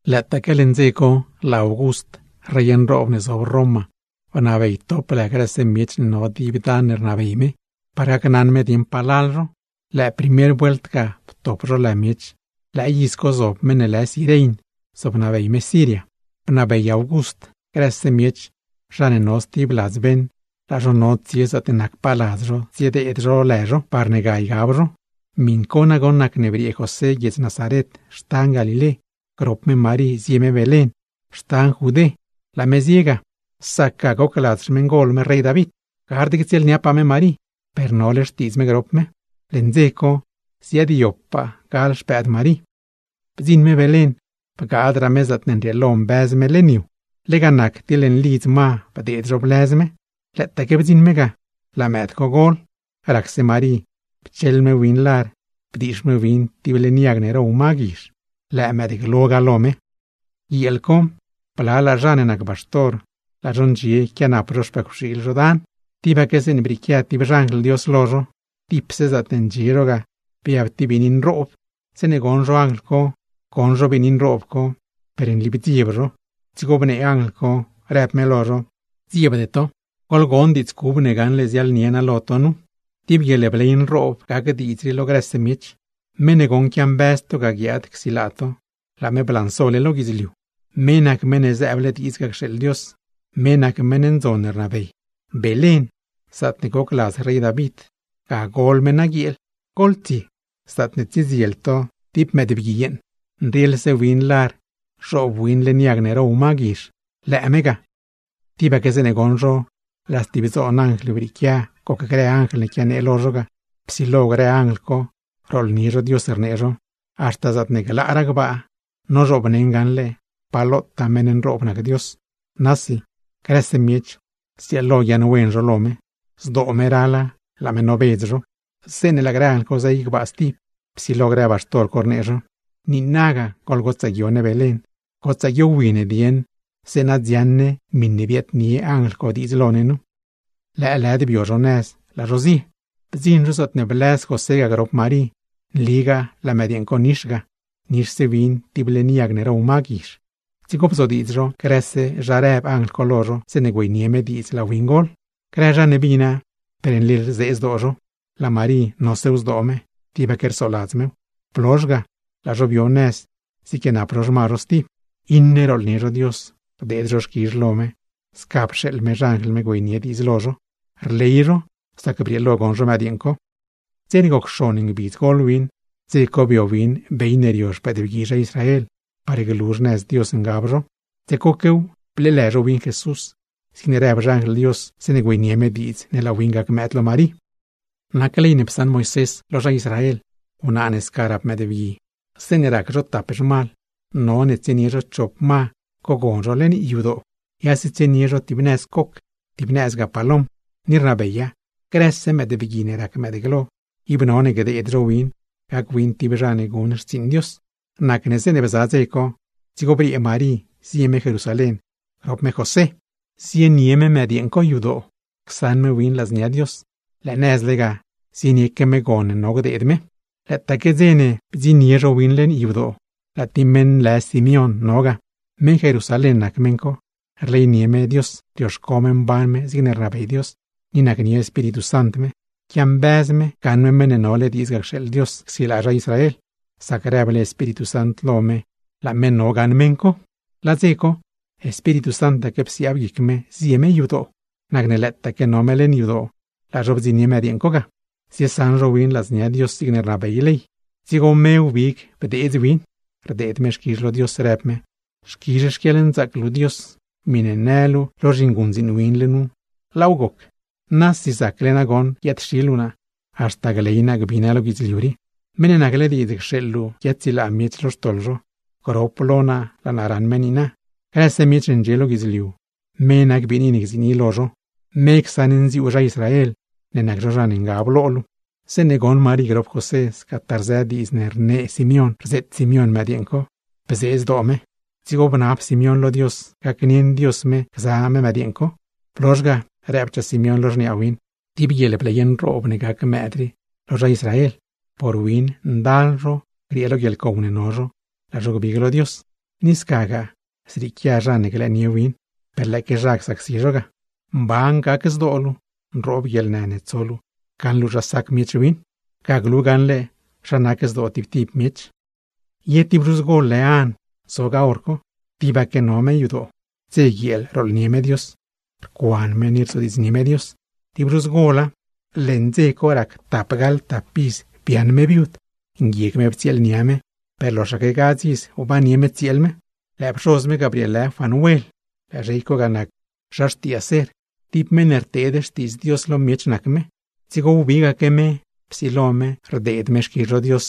Lëëtaaque leṉ dze co, laa August, rey nroob ne zob Roma, bnabey top lë grëse miech ne no dib dan ne rnabey me, par gacnaṉ me dieṉ palal zho. Lëë primer vuelt ga ptop zho lë miech, lëë iz co zob meṉ ne lë Cirein zobnabey me guiedz Siria. Bnabey August grëse miech zha ne no stib ladz beṉ, laa zho no tsie zaatne nacpaa ladz zho tsiedeed zho lë zho, parne ga ygab zho. Miṉ co nagoṉ nacne briee José guiedz Nazaret (xtan Galilé) grop me Marí zie me Belén (xtan Judé). Laa me zie ga, sac ga goc ladz xmeṉgol me rey David. Gard ctsieelniapaa me Marí, per nole xtiidz me grop me. Leṉ dze co ziaadyobpaa gal xpëëd Marí. Bdziṉ me Belén, bgaadraa me zaatne nrieelo mbëz me leṉ yu, lega nac ti leṉ lidz ma bdeed zho blëz me. Lëëtaaque bdziṉ me ga, laa mëëd co gol. Racse Marí pcheḻ me win lar, bdiix me win tib leṉ yag ne row ma guizh; lëë mëëdglo ga lo me. Guieel co, blalaa zha ne nac baxtor, laa zho ndxie quianap zho xpëcwxiil zho dan, tibaque zeeṉe brieequia tib xanjl Dios lo zho, dipse zaatne ndxie zho ga biab tib biini nroob. Zeeṉe goṉ zho anjl co, goṉ zho biini nroob co, per nli bdzieb zho. Dzigo bnee anjl co, rëb me lo zho: ―¡Gdziebde to! ¡Goḻgon diidz cub ne gaṉle ziaḻnie naa lo to nu! ¡Tib guieḻbley nroob gac diidz rii lo grëse miech! Meṉ ne goṉ quiambëz to ga guiaad csilaa to, laa me blansole lo guidzliu. Me nac Meṉ ne zëëble diidz ga cxeeḻ Dios, me nac meṉ ndzon ne rnabey. Belén, zaatne goc ladz rey David, ga gol me naguieel. Goḻtsie, zaatne tsiedziel to tib mëëdbgui yeeṉ, nrieḻse win lar zhoob win leṉ yag ne row ma guizh, lëë me ga. Tibaque zeeṉe goṉ zho laa stib dzoon anjl brieequia gocgrë anjl ne quianee lo zho ga, psilo grë anjl co rooḻnie zho Dios, rnee zho: ¡Haxta zaatne glaaraa gbaa, nozhoobneṉ gaṉle pa lotaa meṉ nroob nac Dios! ¡Nasi, grëse miech zrieelo guiaaṉwen zho lo me; zdoo me rala laa me nobedz zho! Zeeṉe laa grë anjl co zey gbaa stib, psilo grë baxtor co rnee zho: ―¡Niinaga goḻgotsaa guio Belén! ¡Gotsaa guiowi ne dieṉ, zeeṉa dziaṉ ne miṉe biaadnie anjl co diidz lo ne nu! Lëëlëd bio zho nëz laa zho zie. Bdziṉ zho zaatne blëz José ga grop Marí, nligaa laa mëdyeeṉ co nix ga, nixse win tib leṉ yag ne row ma guizh. Dzigo bzodiidz zho grëse zha rëb anjl co lo zho, zeeṉe güeynie me diidz laa win gol. Grë zha ne bina, per nli rzee zdoo zho; laa Marí nosew zdoo me, tibaque rsoladz mew. Blozh ga, laa zho bio nëz ziequianap zho xma zho stib. Iṉe rooḻnie zho Dios, rdeed zho xquizh lo me sca pxeeḻ me xanjl me güeynie diidz lo zho, rley zho sac brieelo goṉ zho mëdyeeṉ co. Dze ne goc xon ngbidz gol win, dze co bio win bey ne rio xpëëdbgui zha Israel, par glu xnëz Dios ngab zho; dze coquew bleelë zho win JESUS, zigne rëb xanjl Dios zeeṉe güeynie me diidz ne laa win gac mëëd lo Marí. Nac ley ne psaṉ Moisés lo zha Israel, wnaa ne sca rap mëëdbgui, zeeṉe rac zho tap zhmal, none tsienie zho chop ma cogon zho leṉ yadoo; yase tsienie zho tib nëz coc, tib nëzgaa palom. Ni rnabeya: “Grëse mëëdbgui ne rac mëëdglo, ib none gdeed zho win gac win tib zha ne guṉ xtsiiṉ Dios.” Nacne zeeṉe bza dze co, dzigo briee Marí zie me Jerusalén grop me José, zienie me mëdyeeṉ co yadoo csaṉ me win ladznia Dios; lëë nëzle ga zienieque me gon ne no gdeed me ga. Lëëtaaque dze ne bdziṉnie zho win leṉ yadoo, laa tib meṉ lë Simeón no ga. Meṉ Jerusalén nac meṉ co, rleynie me Dios, rioxco me mban me zigne rnabey Dios, ni nacnie Espíritu Sant me. Quiambëz me gaṉ me Meṉ ne nole diidz ga cxeeḻ Dios csilaa zha Israel, sac rëble Espíritu Sant lo me ible laa me no gaṉ meṉ co. Laa dze co, Espíritu Santaque psiaab guic me zie me yadoo. Nacne lëëtaque no me leṉ yadoo, laa zho bdziṉnie mëdyeeṉ co ga, ziesaṉ zho win ladznia Dios zigne rnabey ley. Dzigo me wbig bdeedz win, rdeed me xquizh lo Dios, rëb me: Xquizh xquieḻnzaac luu Dios, miṉe në luu lo zhinguṉdziin win luu nu, laaw goc. ¡Nasi zacle nagoṉ guiaad-xi luu naa, haxta gley naa gbi naa lo guidzliu rii! ¡Meṉ ne nacle diidz cxeeḻ luu guiaadsilaa miech lo xtoḻ zho, grop lo naa laa naa raṉ me niina! ¡Grëse miech ne ndxie lo guidzliu, me nac biini ne gziini lo zho! ¡Me csaṉnziuu zha Israel, ne nac zho zha ne ngab lo luu! Zeeṉe goṉ Marí grop José scataa rzë grë diidz ne rnee Simeón rzeet Simeón mëdyeeṉ co, bzee zdoo me. Dzigo bnab Simeón lo Dios gacnieṉ Dios me gza me mëdyeeṉ co. Blozh ga, rëbchaa Simeón lo xniaa win: ―Tib guieḻbley nroob ne gac mëëd rii lo zha Israel, por win ndal zho griee lo guieḻcow ne no zho, laa zho gbig lo Dios. Ni scagaa zrieequia zha ne glëënie win, per lëëque zha csacsi zho ga. Mban gac zdoo luu, nroob guieḻnë ne tso luu gaṉ luu zha sac miech win. Ga glu gaṉle zha nac zdoo tib tib miech. Ye tib zhuz gol lë An zo ga hor co. Tibaque no me yadoo, dze guieel rooḻnie me Dios, rcuan me ni rzodiidznie me Dios. Tib zhuz gola, leṉ dze co rac tapgaḻ tap iz biaaṉ me viud. Nguieg me ptsieelnia me, per loxaque gadz iz wbannie me tsieel me. Lëë pxoz me ga brieelë Fanuel, lëë zhey co ga nac zha xtii Aser. Tib meṉ ne rteed xtiidz Dios lo miech nac me, dzigo wbigaque me, psilo me rdeed me xquizh lo Dios;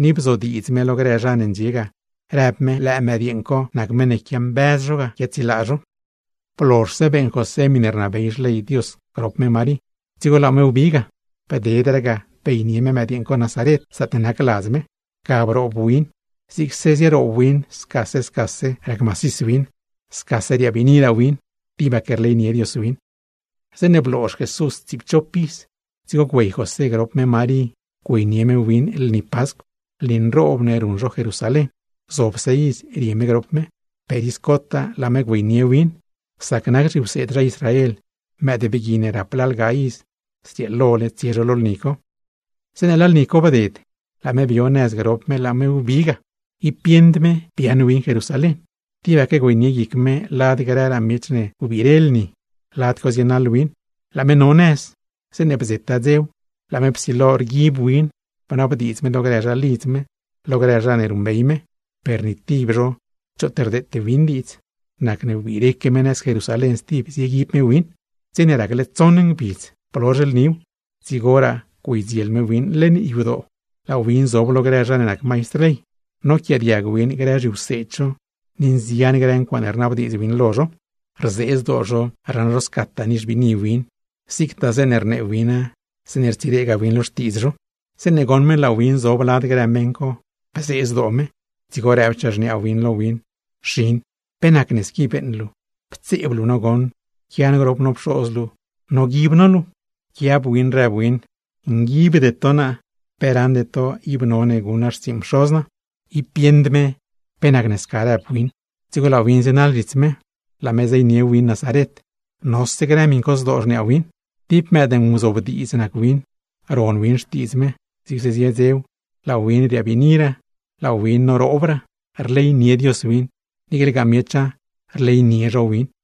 ni bzodiidz me lo grë zha ne ndxie ga, rëb me lëë mëdyeeṉ co ga nac meṉ ne quiambëz zho ga guiaadsilaa zho. Blozhse beeṉ José miṉe rnabey xley Dios grop me Marí, dzigo laa me wbi ga. Bdedraa ga, beynie me mëëd co Nazaret, zaatne nac ladz me. Ga broob win, zigse zieroob win scase scase rac macis win, scase riabiiniraa win. Tibaque nacnie Dios win. Zeeṉe bloozh Jesús tsiipchop iz, dzigo güey José grop me Marí güeynie me win lni Pascw, lni nroob ne ruṉ zho Jerusalén. Gzobse iz rie me grop me, per iz cotaa laa me güeynie win, sac nac zhiwseed zha Israel, mëëdbgui ne rap lalga iz, zrieelole tsie zho lo lni co. Zeeṉe laa lni co bded, laa me bio nëz grop me laa me wbi ga. Ib bieṉd me biaaṉ win Jerusalén, tibaque güeynie guic me lad grëraa miech ne wbire lni, lad co zienaḻ win. Laa me no nëz, zeeṉe bdzetaa dzew, laa me psilo rguib win, bnabdiidz me lo grë zha lidz me, lo grë zha ne ruṉbey me, per ni tib zho choot rdeete win diidz. Nacne wbireque me nëz Jerusalén stib, zieguib me win. Dze ne racle tsoṉ ngbidz blozh lniw, dzigoraa güeydziel me win leṉ yadoo, laa win zob lo grë zha ne nac maistr ley, noquiaadiag win grë zhiwseed zho ni nzian grë ncuaaṉe rnabdiidz win lo zho. Rzee zdoo zho raṉ zho scataa nixbiini win, niicle zeeṉe rnee wina, zeeṉe rtsiregaa win lo xtiidz zho. Zeeṉe goṉ me laa win zob lad grë meṉ co, bzee zdoo me; dzigo rëbchaa xniaa win lo win: ―Xin, ¿pe nacne squi beeṉ luu? Ptseeb luu no goṉ, quia no grop no pxoz luu noguib no luu. Pquiab win rëb win: ―Nguibde to naa. ¿Pe raṉde to ib none guṉ naa xtsiiṉ Pxoz naa? Ib bieṉd me pe nacne sca rëb win. Dzigo laa win zienaḻ zhits me, laa me zeynie win Nazaret; nose grë miṉ co zdoo xniaa win. Tib mëëd nguzobdiidz nac win, ron win xtiidz me. Zigse zie dzew, laa win riabiiniraa, laa win noroobraa; rleynie Dios win, niiclegaa miecha rleynie zho win.